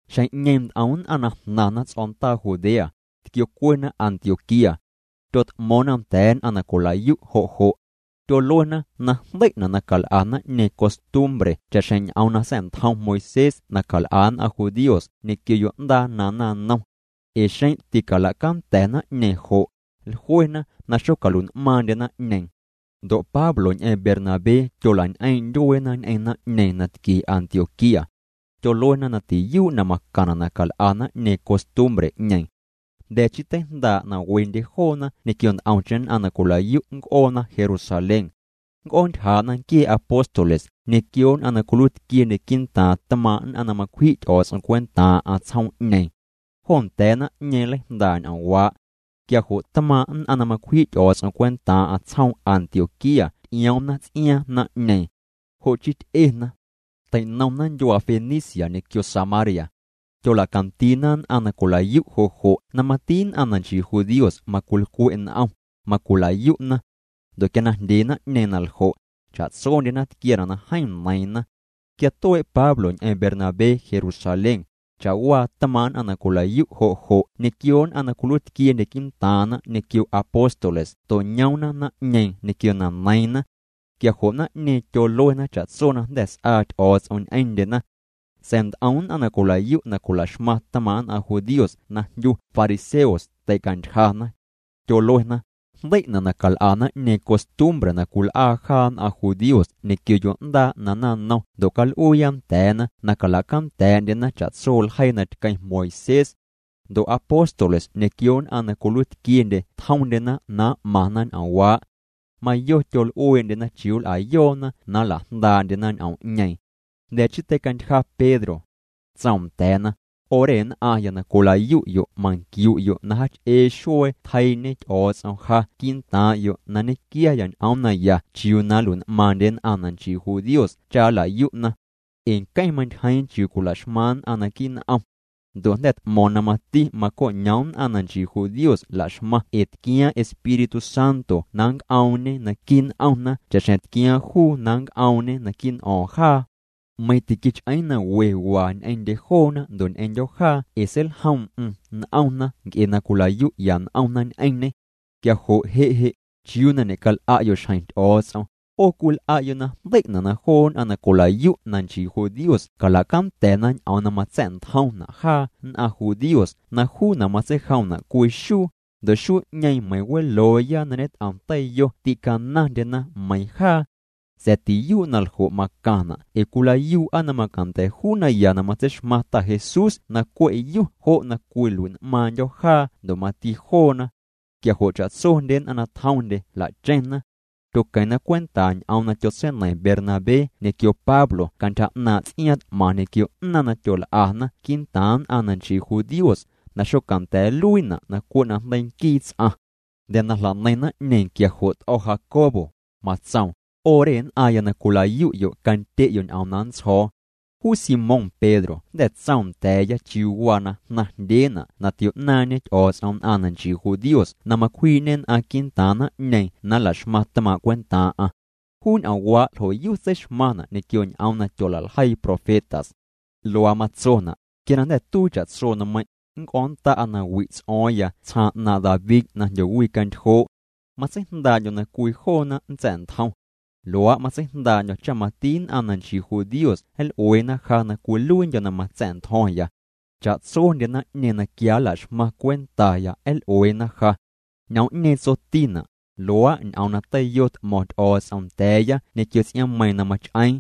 Xjeⁿ'ñeeⁿ nt'om nn'aⁿ jnaⁿna ts'o̱ndaa Judea, tquiocuena Antioquía. Tyot'mo̱o̱ⁿna nda̱a̱ nn'aⁿ na cwilayu' jo' jo'. Tyoluena na jndei'na' na cal'a naⁿ'ñeeⁿ costumbre cha'xjeⁿ ñ'oom na sa̱'ntjom Moisés na cal'a nn'aⁿ judíos ñequio yo'ndaa na naⁿnom. Ee xeⁿ ticalacanda̱ naⁿ'ñeeⁿ jo', jluena na xocalui'n'maaⁿndye naⁿ'ñeeⁿ. Ndo' Pablo ñ'eⁿ Bernabé tyolañ'eeⁿ' ndyueena ñ'eⁿ naⁿ'ñeeⁿ na tquie Antioquía. Tyoluena na tiyuu' na macaⁿna' na cal'a naⁿ'ñeeⁿ costumbre'ñeeⁿ. Jnda̱ chii teijndaa' na wendye joona ñequio nt'omcheⁿ nn'aⁿ na cwilayu' nnc'oona Jerusalén. Nnc'oontyjaa'na nquie apóstoles ñequio nn'aⁿ na cwiluiitquiendye quii'ntaaⁿ tmaaⁿ' nn'aⁿ na macwji' Ty'o̱o̱ts'om cwentaaⁿ'aⁿ tsjoom'ñeeⁿ. Jo nda̱a̱ naⁿ'ñeeⁿ nleijndaa' ñ'oomwaa'. Quia jo' tmaaⁿ' nn'aⁿ na macwji' Ty'o̱o̱ts'om cwentaaⁿ'aⁿ tsjoom Antioquía ty'ioomna ts'iaaⁿ naⁿ'ñeeⁿ. Jo' chii ty'ena. Teinomna ndyuaa Fenicia ñequio Samaria. Tyolacandiina nn'aⁿ na cwilayu' jo' jo' na mati nn'aⁿ na nchii judíos macwilcwe' n'om, macwilayu'na. Ndo' quia na jndye naⁿ'ñeeⁿ na ljo', cha'tsondyena tquiaana' na jeeⁿ neiiⁿna. Quia tuee' Pablo ñ'eⁿ Bernabé Jerusalén, cha'waa tmaaⁿ' nn'aⁿ na cwilayu' jo' jo' ñequio nn'aⁿ na cwiluiitquiendye quii'ntaaⁿna ñequio apóstoles to'ñoomna naⁿ'ñeeⁿ ñequio na neiiⁿna. Quia jo' naⁿ'ñeeⁿ tyoluena cha'tso na jnda̱ s'aa Ty'o̱o̱ts'om ñ'eⁿndyena. Sa̱a̱ nt'om nn'aⁿ na cwilayu' na cwilaxmaⁿ tmaaⁿ' nn'aⁿ judíos na jndyu fariseos teicantyjana. Tyoluena: —Jndei'na' na cal'a naⁿ'ñeeⁿ costumbre na cwil'aa jaa nn'aⁿ judíos ñequio yo'ndaa na naⁿnom ndo' cal'uuya nda̱a̱na na calacanda̱a̱'ndyena cha'tso ljeii na tqueⁿ Moisés. Ndo' apóstoles ñequio nn'aⁿ na cwiluiitquiendye tjomndyena na m'maⁿna ñ'oomwaa'. Mayo tyol'uee'ndyena chiuu nl'ayoona na nlajndaa'ndyena ñ'oom'ñeeⁿ. Jnda̱ chii teicantyja Pedro. Tsoom nda̱a̱na: —'O re nn'aⁿya na cwilayu'yo' manquiu'yo' na jaach'ee xuee tjeii'ñe Ty'o̱o̱ts'om ja quii'ntaaⁿ'yo' na nñequiaya ñ'oom naya chiuu na nlui'n'maaⁿndye nn'aⁿ na nchii judíos cha nlayu'na. Ee nqueⁿ mantyjeeⁿ chiuu cwila'xmaⁿ nn'aⁿ naquii' n'om. Ndo' jnda̱ t'mo̱o̱ⁿ na mati maco'ñoom nn'aⁿ na nchii judíos laxmaⁿ ee tquiaaⁿ Espíritu Santo na nnc'oomñe naquii' n'omna cha'xjeⁿ tquiaaⁿ juu na nnc'oomñe naquii' n'o̱o̱ⁿ jaa. Meiⁿ tiquich'eeⁿ na we waa ñ'eⁿndye joona ndo' ñ'eⁿndyo̱ jaa ee seiljoom'm n'omna nc'e na cwilayu'ya n'omna ñ'eⁿñê. Quia jo' je' je' ¿chiuu na ñe'cal'a'yo' xjeⁿ Ty'o̱o̱ts'om? 'O cwil'a'yo' na jndei'na' na joo nn'aⁿ na cwilayu' na nchii judíos calacanda̱na ñ'oom na matsa̱'ntjomna' jaa nn'aⁿ judíos na juuna' matseijomna' cwii xuu, ndo' xuu'ñeeⁿ meiⁿ welooya na ñet'om teiyo tîcanaⁿndyena meiⁿ jaa. Sa̱a̱ tiyuu' na ljo' macaⁿna' ee cwilayuu'a na macanda̱ juu naya na matseixmaⁿ Ta Jesús na cwe' yu jo' na cwilui'n'maaⁿndyo̱ jaa ndo' mati joona. Quia jo' cha'tsondye nn'aⁿ na tjomndye jla'cheⁿna. Tyoqueⁿna cwenta ñ'oom na tyotseineiⁿ Bernabé ñequio Pablo cantyja 'naaⁿ' ts'iaaⁿ t'maⁿ ñequio 'naaⁿ na tyol'ana quii'ntaaⁿ nn'aⁿ na nchii judíos na xocanda̱a̱ nluiina' na cwe' najndeii nquii ts'aⁿ. Jnda̱ na jla'neiⁿ naⁿ'ñeeⁿ quia jo' t'o̱ Jacobo, matsoom: —'O re nn'aⁿya na cwilayu'yo' candye'yo' ñ'oom na nntsjo̱o̱. Juu Simón Pedro jnda̱ tsoom nda̱a̱ya chiuu waa na jnaⁿjndyeena' na tio'naaⁿñe Ty'o̱o̱ts'om nn'aⁿ na nchii judíos na macwjii'ñê nn'aⁿ quii'ntaaⁿ naⁿ'ñeeⁿ na nlaxmaⁿ tmaaⁿ' cwentaaⁿ'aⁿ. Juu ñ'oomwaa' ljo'yu tseixmaⁿna' ñequio ñ'oom na tyola'ljeii profetas. Luaa matsona': Quia na jnda̱ tuii cha'tso nmeiⁿ', nnc'o̱o̱ⁿnnda'a na wi' ts'o̱o̱ⁿya tsjaaⁿ 'naaⁿ' David na jndyowicantyjoo'. Matseijndaa'ndyo̱ na cwii joona nntsa̱'ntjom. Luaa' matseijndaa'ndyo̱ cha mati nn'aⁿ na nchii judíos nl'ueena ja na cwiluiindyo̱ na matsa̱'ntjo̱ⁿya. Cha'tsondye naⁿ'ñeeⁿ na quia nlaxmaⁿ cwentaya nl'ueena ja. Ñ'oom'ñeeⁿ tsotina': Luaa' ñ'oom na teiyo t'mo̱ⁿ Ty'o̱o̱ts'om nda̱a̱ya ñequio ts'iaaⁿmeiiⁿ na mach'eeⁿ.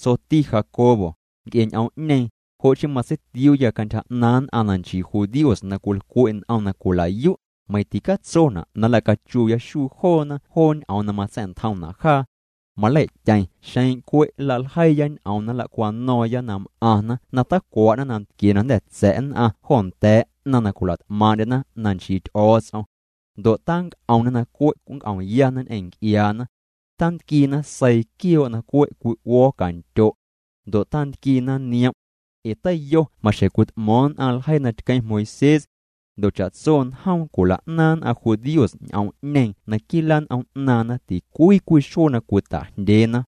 Tsoti Jacobo: —Nc'e ñ'oom'ñeeⁿ, jo' chii matseitiuuya cantyja 'naaⁿ nn'aⁿ na nchii judíos na cwilcwe' n'om na cwilayu', meiⁿ ticatsona' na nlacachuuya xuu joona joo ñ'oom na matsa̱'ntjomna' jaa. Malei'tyeⁿ xeⁿ cwe' nlaljeiiya ñ'oom na nlacwano̱o̱ⁿya na m'aⁿna na tacwa'na nantquie na jnda̱ tsa̱' nn'aⁿ jo nda̱a̱ 'naⁿ na cwila't'maaⁿ'ndyena na nchii Ty'o̱o̱ts'om. Ndo' tanc'omna na cwe' nnc'omyana ñ'eⁿ nc'iaana. Tantquiina seii quioo' na cwe' cwi'uo̱o̱ cantyo'. Ndo' tantquiina niom'. Ee teiyo maxjeⁿ cwit'mo̱o̱ⁿ nn'aⁿ ljeii na tqueⁿ Moisés. Ndo' cha'tso njoom cwila'naaⁿ nn'aⁿ judíos ñ'oom'ñeeⁿ naquii' lan'om 'naaⁿna ticwii cwii xuee na cwita'jndyeena.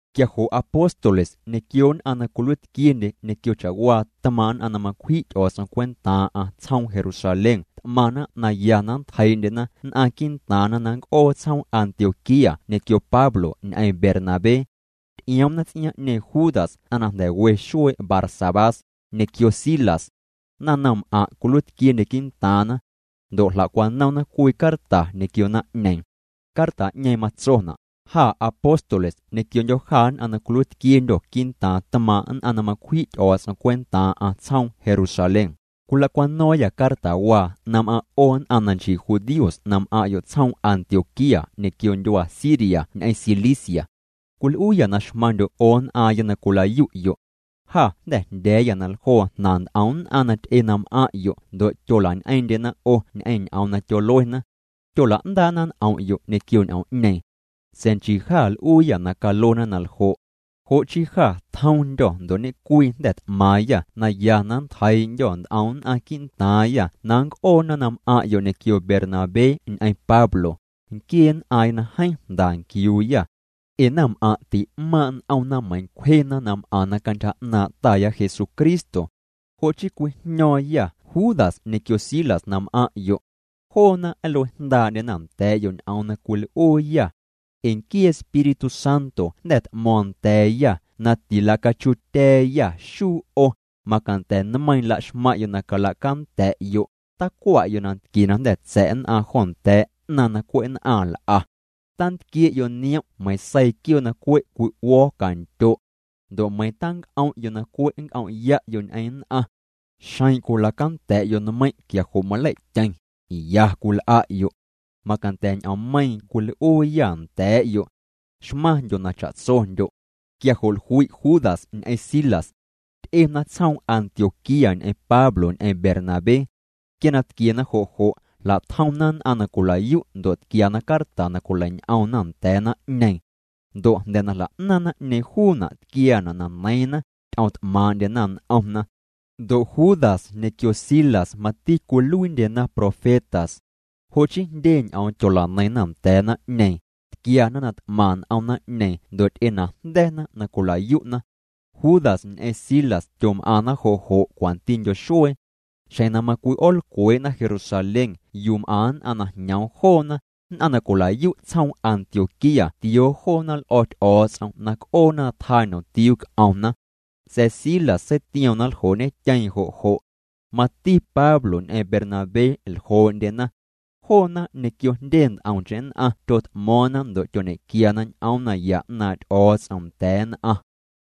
Quia jo' apóstoles ñequio nn'aⁿ na cwiluiitquiendye ñequio cha'waa tmaaⁿ' nn'aⁿ na macwji' Ty'o̱o̱ts'om cwentaaⁿ'aⁿ tsjoom Jerusalén t'maⁿna na ya na nntjeii'ndyena nn'aⁿ quii'ntaaⁿna na nnc'oo tsjoom Antioquía ñequio Pablo ñ'eⁿ Bernabé. Ty'ioomna ts'iaaⁿ'ñeeⁿ Judas ts'aⁿ na jnda̱ we xuee' Barsabás, ñequio Silas. Naⁿnomm'aⁿ' cwiluiitquiendye quii'ntaaⁿna. Ndo' jla'cwanomna cwii carta ñequio naⁿ'ñeeⁿ. Carta'ñeeⁿ matsona': “Jâ apóstoles ñequiondyo̱ jâ nn'aⁿ na cwiluiitquiendyô̱ quii'ntaaⁿ tmaaⁿ' nn'aⁿ na macwji' Ty'o̱o̱ts'om cwentaaⁿ'aⁿ tsjoom Jerusalén, cwilacwano̱o̱ⁿyâ cartawaa na m'aⁿ' 'o nn'aⁿ na nchii judíos na m'aⁿ'yo' tsjoom Antioquía ñequio ndyuaa Siria ñ'eⁿ Cilicia. Cwil'uuyâ na xmaⁿndyo' 'o nn'aaⁿya na cwilayu'yo'. Jâ jnda̱ jndya̱a̱yâ na ljoo jnaⁿ nt'om nn'aⁿ na ty'e na m'aⁿ'yo' ndo' tyolañ'eeⁿ'ndyena 'o ñ'eⁿ ñ'oom na tyoluena. Tyola'ndaa'na n'om'yo' ñequio ñ'oom'ñeeⁿ. Sa̱a̱ nchii jâ l'uuyâ na caluena na ljo'. Jo' chii jâ tjomndyô̱ ndo' ñe'cwii jnda̱ t'maaⁿyâ na ya na nntjeii'ndyô̱ nt'om nn'aⁿ quii'ntaaⁿyâ na nnc'oona na m'aⁿ'yo' ñequio Bernabé ñ'eⁿ Pablo, nquiee nn'aaⁿya na jeeⁿ jnda nquiuuya. Ee naⁿm'aⁿ' ti'maaⁿ' n'omna meiⁿ cwjena na m'aⁿna cantyja 'naaⁿ' Taya Jesucristo. Jo' chii cwijño̱o̱ⁿyâ Judas ñequio Silas na m'aⁿ'yo'. Joona nlue jndaa'ndyena nda̱a̱'yo' ñ'oom na cwil'uuyâ. Ee nquii Espíritu Santo jnda̱ t'mo̱o̱ⁿ nda̱a̱yâ na tilacachuutya̱a̱yâ xuu 'o, macanda̱ nmeiiⁿ laxmaⁿ'yo' na calacanda̱'yo': Tacwa'yo' nantquie na jnda̱ tsa̱' nn'aⁿ jo nda̱a̱ 'naⁿ na cwe' nn'aⁿ l'a. Tantquie'yo' niom' meiiⁿ seii quioo' na cwe' cwi'uo̱o̱ cantyo'. Ndo' meiⁿ tanc'om'yo' na cwe' nnc'om'ya'yo' ñ'eⁿ nn'aⁿ. Xeⁿ cwilacanda̱'yo' nmeiⁿ' quia jo' malei'tyeⁿ, ya cwil'a'yo'. Macanda̱ ñ'oommeiiⁿ cwil'uuyâ nda̱a̱'yo'. Xmaⁿndyo' na cha'tsondyo'.” Quia jo' jlui' Judas ñ'eⁿ Silas. Ty'ena tsjoom Antioquía ñ'eⁿ Pablo ñ'eⁿ Bernabé. Quia na tquiena jo' jo' jla'tjomna nn'aⁿ na cwilayu' ndo' tquiana carta na cwileiñ'omna nda̱a̱ naⁿ'ñeeⁿ. Ndo' jnda̱ na jla'naaⁿ naⁿ'ñeeⁿ juuna' tquiaana' na neiiⁿna, ty'omt'maaⁿ'ndyena n'omna. Ndo' Judas ñequio Silas, mati cwiluiindyena profetas. Jo' chii jndye ñ'oom tyola'neiⁿna nda̱a̱ naⁿ'ñeeⁿ, tquiana na t'maⁿ n'om naⁿ'ñeeⁿ ndo' ty'enajnda̱na na cwilayu'na. Judas ñ'eⁿ Silas tyom'aⁿna jo' jo' cwantindyo xuee. Xjeⁿ na macwi'oolcwee'na Jerusalén yuu m'aⁿ nn'aⁿ na jñoom joona, nn'aⁿ na cwilayu' tsjoom Antioquía tioo joona l'o̱ Ty'o̱o̱ts'om na c'oona na tjaa ñomtiuu c'omna. Sa̱a̱ Silas seitioom na nljoo'ñetyeeⁿ jo' jo'. Mati Pablo ñ'eⁿ Bernabé ljoo'ndyena. Joona ñequio jndye nt'omcheⁿ nn'aⁿ tyot'mo̱o̱ⁿna ndo' tyoñequiana ñ'oom naya 'naaⁿ' Ty'o̱o̱ts'om nda̱a̱ nn'aⁿ.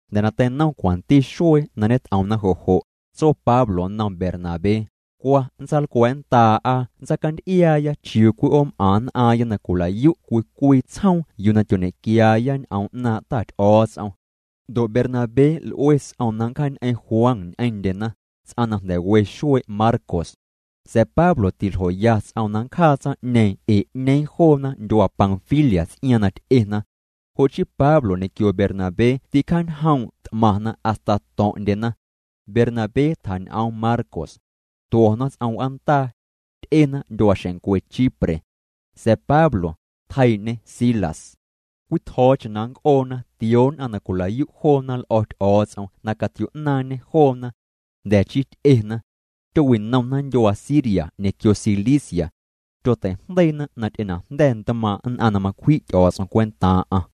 Jnda̱ na teinom cwanti xuee na ñet'omna jo' jo', tso Pablo nnom Bernabé: —Cwa nntsaalcwa̱a̱'nndaa'a nntsacanty'iaaya chiuu cwi'oom'aⁿ nn'aaⁿya na cwilayu' cwii cwii tsjoom yuu na tyoñequiaaya ñ'oom 'naaⁿ' Ta Ty'o̱o̱ts'om. Ndo' Bernabé l'ue ts'oom na nncjaañ'eⁿ Juan ñ'eⁿndyena, ts'aⁿ na nda̱ we xuee' Marcos. Sa̱a̱ Pablo tiljoya ts'oom na nncjaa tsaⁿ'ñeeⁿ ee 'ñeeⁿ joona ndyuaa Panfilia ts'iaaⁿ na ty'ena. Jo' chii Pablo ñequio Bernabé ticjaañjoom' t'maⁿna hasta to̱ⁿ'ndyena. Bernabé tjañ'oom Marcos. Tuo̱na ts'om w'aandaa. Ty'ena ndyuaaxeⁿncwe Chipre. Sa̱a̱ Pablo, tjeii'ñê Silas. Cwii tjo̱o̱cheⁿ na nnc'oona tioo nn'aⁿ na cwilayu' joona l'o̱ Ty'o̱o̱ts'om na catio'naaⁿñê joona. Jnda̱ chii ty'ena. Tyowi'nomna ndyuaa Siria ñequio Cilicia. Tyotei'jndeiina na ty'enajnda̱ ntmaaⁿ' nn'aⁿ na macwji' Ty'o̱o̱ts'om cwentaaⁿ'aⁿ.